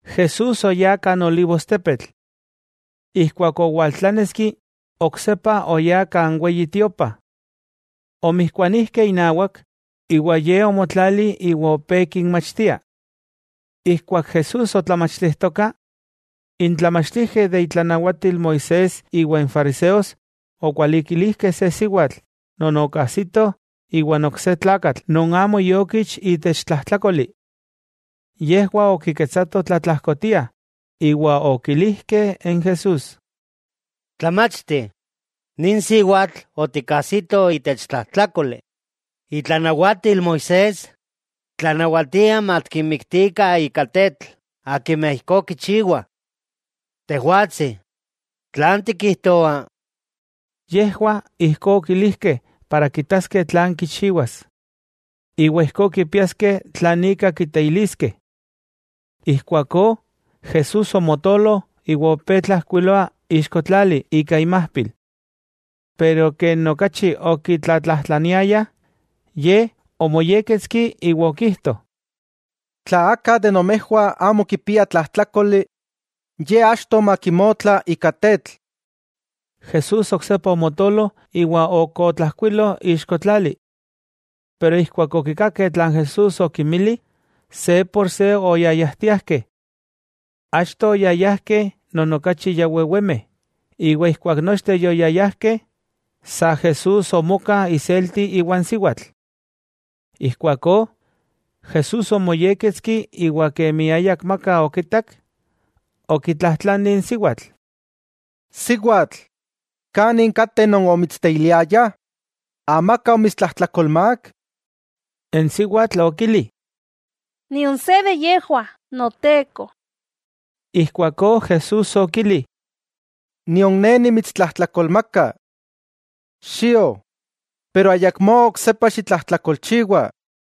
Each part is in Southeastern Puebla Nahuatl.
Jesús oyá kan olivostepetl. Ijkuak owaltláneski, oksepa oyá kan Weyi Tiopa. Omijkuanijkeh inawak, iwa Ye omotlali iwa opé kinmachtia. Ijkuak Jesús otlamachtijtoka, n tlamachtijkeh de itlanawatil Moisés iwa n fariseos okualikilijkeh se siwatl non okajsitoh iwan ok se tlakatl non amo iokich itech tlajtlákoli. Yejwah okiketsatoh tlatlajkotiah, iwa okilijkeh n Jesús: —Tlamachti, nin siwatl otikajsitoh itech tlajtlákoli. Itlanawatil Moisés tlanawatia matikinmiktikah ika tetl akimeh ijkó kichiwah. Tejwatsi, ¿tlan tikijtoa? Yejwah ijkó okilijkeh para kitaskeh tlan kichiwas, iwa ijkó kipiaskeh tlan ika kiteiliskeh. Ijkuakó Jesús omotolo iwa opé tlajkuiloa ixko tlali ika imajpil. Pero kemi okachi okitlatlajtlaniayah, Ye omoyékketski iwa okijto: —Tla aka de nomejwah amo kipia tlajtlákoli, ye achto makimotla ika tetl. Jesús oksepa omotolo iwa ok otlajkuilo ixko tlali. Keman okikakeh tlan Jesús okinmili, se por se oyayajtiajkeh. Achto oyayajkeh non okachi ya wewemeh, iwa ijkuak nochteh yoyayajkeh, sa Jesús omoka iselti iwan siwatl. Ijkuakó, Jesús omoyékketski iwa kemi ayakmaka okitak, okitlajtlani n siwatl: —Siwatl, ¿kanin kateh non omitsteiliayah? ¿Amaka omitstlajtlakolti? N siwatl okili: —Nion se de yejwah Noteko. Ijkuakó Jesús okili: —Nion Ne omitstlajtdlakolti. Xio, iwa ayakmó oksepa xitlajtlakolchiwa.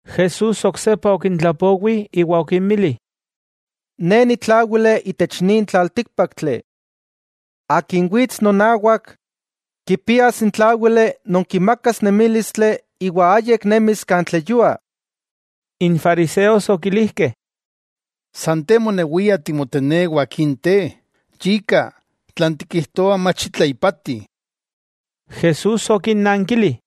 Jesús oksepa okintlapowi iwa okinmili: —Ne nitláwili itech nin tlaltíkpaktli. Akin wits nonawak, kipias n tláwili non kimakas nemílistli iwa ayik nemis kan tleyua. N fariseos okilijkeh: —San Te monewia timotenewa akin te, yika, tlan tikijtoa mach itla ipati. Jesús okinnankili: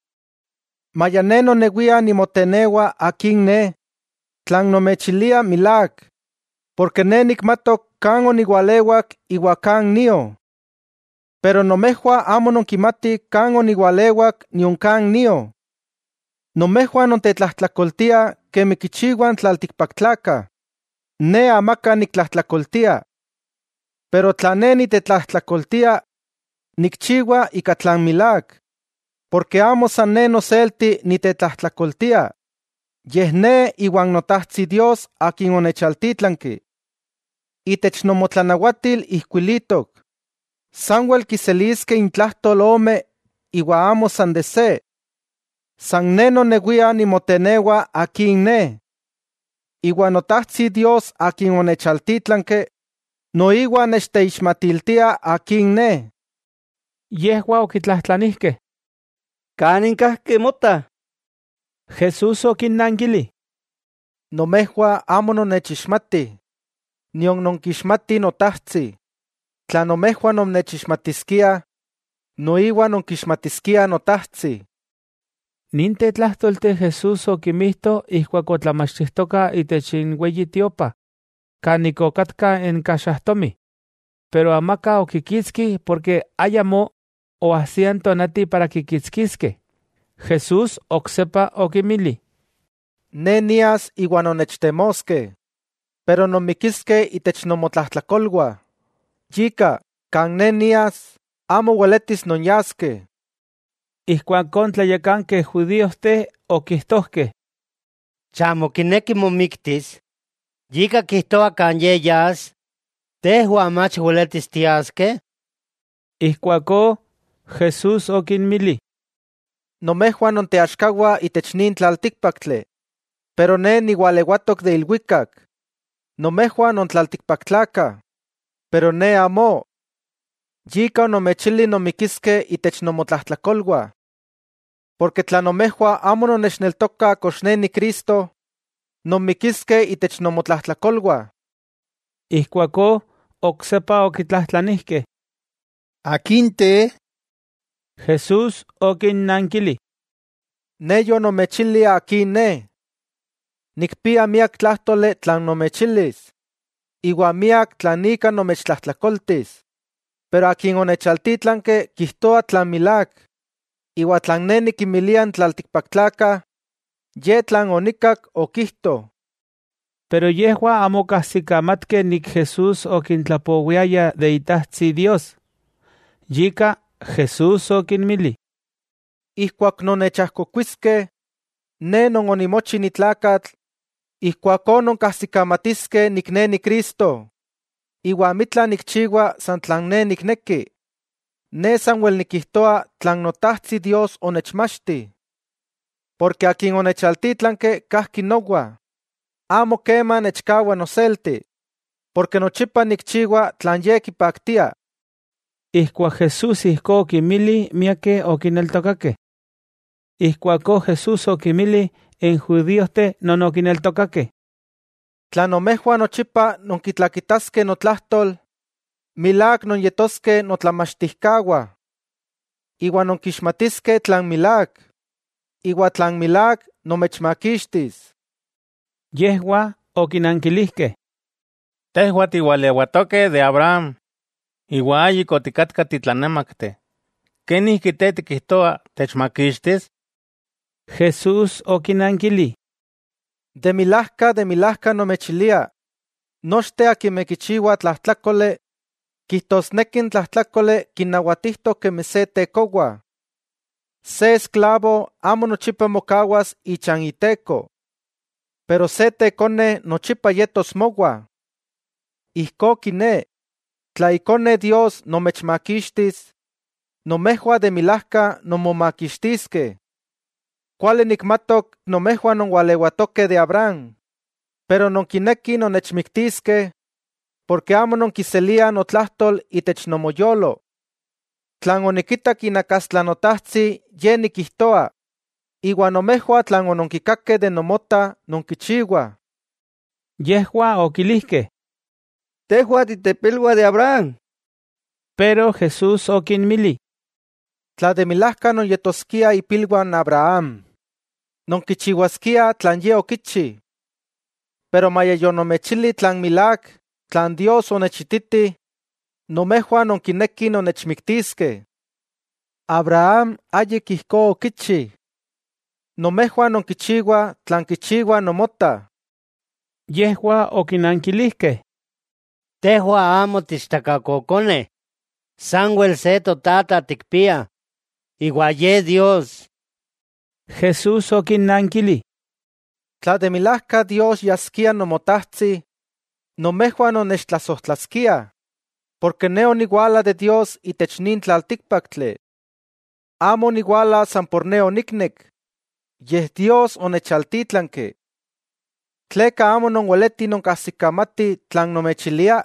—Maya Ne nonewia nimotenewa Akin Ne, tlan nomechilia milák, porke Ne nikmatok kan oniwalewak iwa kan nio. Pero nomejwah amo nonkimatih kan oniwalewak nion kan nio. Nomejwah nontetlajtlakoltiah kemi kichiwah n tlaltikpaktlakah. Ne amaka niktlajtlakoltia. Pero tla Ne nitetlajtlakoltia, nikchiwa ika tlan milák, porke amo san Ne noselti nitetlajtlakoltia, yej Ne iwan Notajtsi Dios akin onechaltítlanki. Itech nomotlanawatil ijkuilitok, sanwel kiseliskeh intlajtol ome iwa amo san se. San Ne nonewia nimotenewa akin Ne, iwa Notajtsi Dios Akin onechaltítlanki, noiwa nechteixmatiltia akin Ne. Yejwah okitlajtlanijkeh: —¿Kanin kajki Mota? Jesús okinnankili: —Nomejwah amo nonnechixmatih, nion nonkixmatih Notajtsi, tla nomejwah nonnechixmatiskiah, noiwa nonkixmatiskiah Notajtsi. Ninteh tlájtolteh Jesús okimijto ijkuak otlamachtijtoka itech n Weyi Tiopa kan ik okatka n kaxajtomij. Pero amaka okikitski porke ayamó oajsia n tonati para kikitskiskeh. Jesús oksepa okinmili: —Ne nias, iwa nonnechtemoskeh, pero nonmikiskeh itech nomotlajtlakolwah. Yika, kan Ne nias, amo weletis nonyaskeh. Ijkuakó n tlayakankeh judíojteh okijtojkeh: —¿Chamo kineki momiktis, yika kijtoa kan Ye yas, tejwah mach weletis tiaskeh? Ijkuakó Jesús okinmili: —Nomejwah nonteaxkawah itech nin tlaltíkpaktli, pero Ne niwalewatok de ilwikak. Nomejwah non tlaltikpaktlakah, pero Ne amó. Yika onomechili nonmikiskeh itech nomotlajtlakolwah. Porke tla nomejwah amo nonnechneltokah kox Ne Ni Cristo, nonmikiskeh itech nomotlajtlakolwah. Ijkuakó oksepa okitlajtlanijkeh: —¿Akin te? Jesús okinnankili: —Ne yonomechili Akin Ne. Nikpia miak tlájtoli tlan nomechilis iwa miak tlan ika nomechtlajtlakoltis, pero Akin onechaltítlanki kijtoa tlan milák, iwa tlan Ne nikinmilia n tlaltikpaktlakah ye tlan onikkak, okijto. Yejwah amo okajsikamatkeh Jesús okintlapowiaya de Itajtsi Dios. Yika Jesús okinmili: —Ijkuak nonnechajkokuiskeh, Ne non onimochi ni tlakatl, ijkuakó nonkajsikamatiskeh Ne Ni Cristo, iwa amitla nikchiwa san tlan Ne nikneki. Ne sanwel nikijtoa tlan Notajtsi Dios onechmachti. Porke Akin onechaltítlanki kajki nowa. Amo kema nechkawa noselti, porke nochipa nikchiwa tlan Ye kipaktia. Ijkuak Jesús ijkó okinmili miakeh okineltokakeh. Ijkuakó Jesús okinmili n judíojteh non okineltokakeh: —Tla nomejwah nochipa nonkitlakitaskeh notlajtol, milák nonyetoskeh notlamachtijkawah. Iwa nonkixmatiskeh tlan milák, iwa tlan milák nomechmakixtis. Yejwah okinankilijkeh: —Tejwah tiwalewatokeh de Abraham, iwa ayik otikatkah titlanemakteh, ¿kenijki Te tikijtoa techmakixtis? Jesús okinankili: —De milajka, de milajka nomechilia, nochteh akimeh kichiwa tlajtlákoli kijtosneki n tlajtlákoli kinnawatijtok kemi se tekowa. Se esklavo amo nochipa mokawas ichan iteko. Pero se tekone nochipa yetos mowa. Ijkó kiné, tla Ikone Dios nomechmakixtis, nomejwah de milajka nonmomakixtiskeh. Kuali nikmatok nomejwah nonwalewatokeh de Abraham. Pero nonkinekih nonnechmiktiskeh porke amo nonkiseliah notlajtol itech nomoyolo. Tlan onikitak inawak Notajtsi, ye nikijtoa. Iwa nomejwah tlan ononkikakeh de nomota nonkichiwah. Yejwah okilijkeh: —¡Tejwah titepilwah de Abraham! Jesús okinmili: —Tla de milajka nonyetoskiah ipilwah Abraham, nonkichiwaskiah tlan Ye okichi. Pero maya yonomechili tlan milák, tlan Dios onechititi, nomejwah nonkinekih nonnechmiktiskeh. ¡Abraham ayik ijkó okichi! Nomejwah nonkichiwah tlan kichiwa nomota. Yejwah okinankilijkeh: —Tejwah amo tiichtakakokoneh, sanwel se totata tikpiah, iwa Ye Dios. Jesús okinnankili: —Tla de milajka Dios yaskia Nomotajtsi, nomejwah nonnechtlasojtlaskiah, porke Ne oniwala de Dios itech nin tlaltíkpaktli. Amo oniwala san por Ne oniknek, yej Dios onechaltítlanki. ¿Tleka amo nonweletih nonkajsikamatih tlan nomechilia?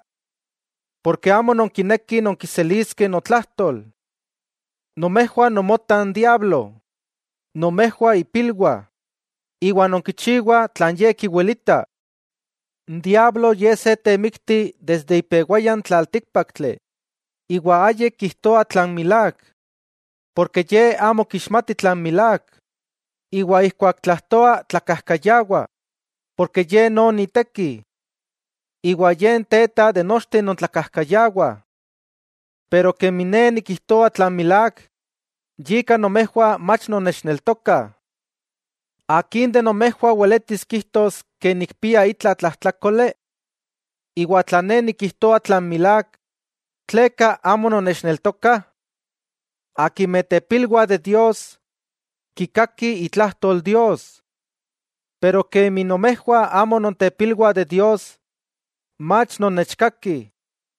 Porke amo nonkinekih nonkiseliskeh notlajtol. Nomejwah nomota n diablo, nomejwah ipilwah, iwa nonkichiwah tlan ye kiwelita. N diablo ye se temikti desde ipewaya n tlaltíkpaktli iwa ayik kijtoa tlan milák. Porke ye amo kixmati tlan milák, iwa ijkuak tlajtoa, tlakajkayawa porke ye non iteki. Iwa ye n teta de nochteh non tlakajkayawah. Pero kemi Ne nikijtoa tlan milák, yika nomejwah mach nonnechneltokah. ¿Akin de nomejwah weletis kijtos ke nikpia itla tlajtlákoli? Iwa tla Ne nikijtoa tlan milák, ¿tleka amo nonnechneltokah? Akimeh tepilwah de Dios, kikakih itlajtol Dios. Pero kemi nomejwah amo nontepilwah de Dios, mach nonnechkakih.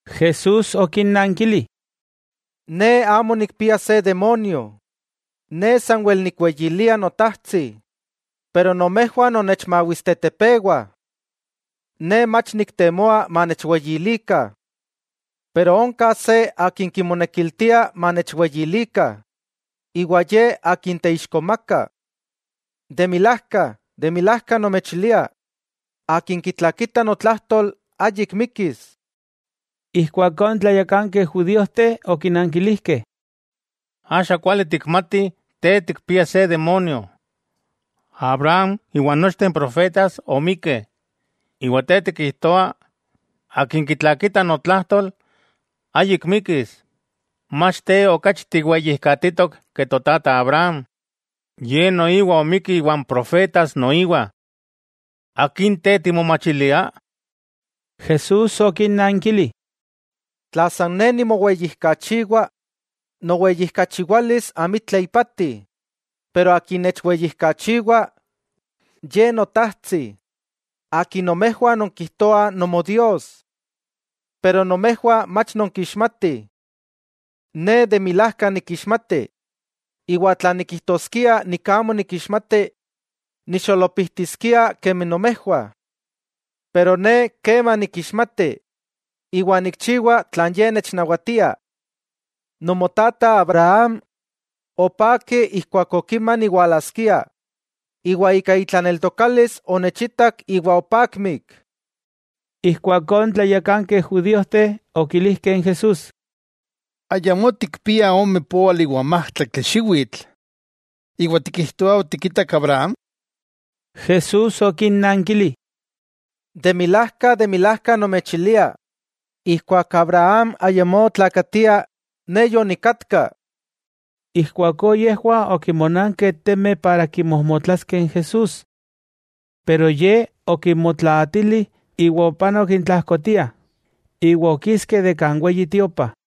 Jesús okinnankili: —Ne amo nikpia se demonio. Ne sanwel nikweyilia Notajtsi, pero nomejwah nonnechmawistetepewah. Ne mach niktemoa manechweyilikah. Pero onka se Akin kimonekiltia manechweyilikah, iwa Ye Akin teixkomakah. De milajka, de milajka nomechilia, akin kitlakita notlajtol, ayik mikis. Ijkuakó n tlayakankeh judíojteh okinankilijkeh: —Axa kuali tikmatih te tikpia se demonio. Abraham iwa nochteh n profetas omikkeh, iwa te tikijtoa: “akin kitlakita notlajtol, ayik mikis.” ¿Mach te okachi tiweyijkatitok ke Totata Abraham? Ye noiwa omikki iwa n profetas noiwa. ¿Akin te timomachilia? Jesús okinnankili: —Tla san Ne nimoweyijkachiwa, noweyijkachiwalis amitla ipati. Pero Akin nechweyijkachiwa, Ye Notajtsi, Akin nomejwah nonkijtoah Nomodios. Pero nomejwah mach nonkixmatih. Ne de milajka nikixmati, iwa tla nikijtoskia amo nikixmati, nixolopijtiskia kemi nomejwah. Pero Ne kema nikixmati, iwa nikchiwa tlan Ye nechnawatia. Nomotata Abraham, opaki ijkuak okima niwalaskia, iwa ika itlaneltokalis onechitak iwa opakmik. Ijkuakó n tlayakankeh judíojteh okilijkeh n Jesús: —Ayamó tikpia ome póali iwa n májtlaktli xiwitl, ¿iwa tikijtoa otikitak Abraham? Jesús okinnankili: —De milajka, de milajka nomechilia: ¡Ijkuak Abraham ayamó otlakatia, Ne yonikatka! Ijkuakó yejwah okinmonankeh temeh para kimojmotlaskeh n Jesús. Pero Ye okinmotlaatili, iwa opanok intlajkotiah, iwa okiski de kan Weyi Tiopa.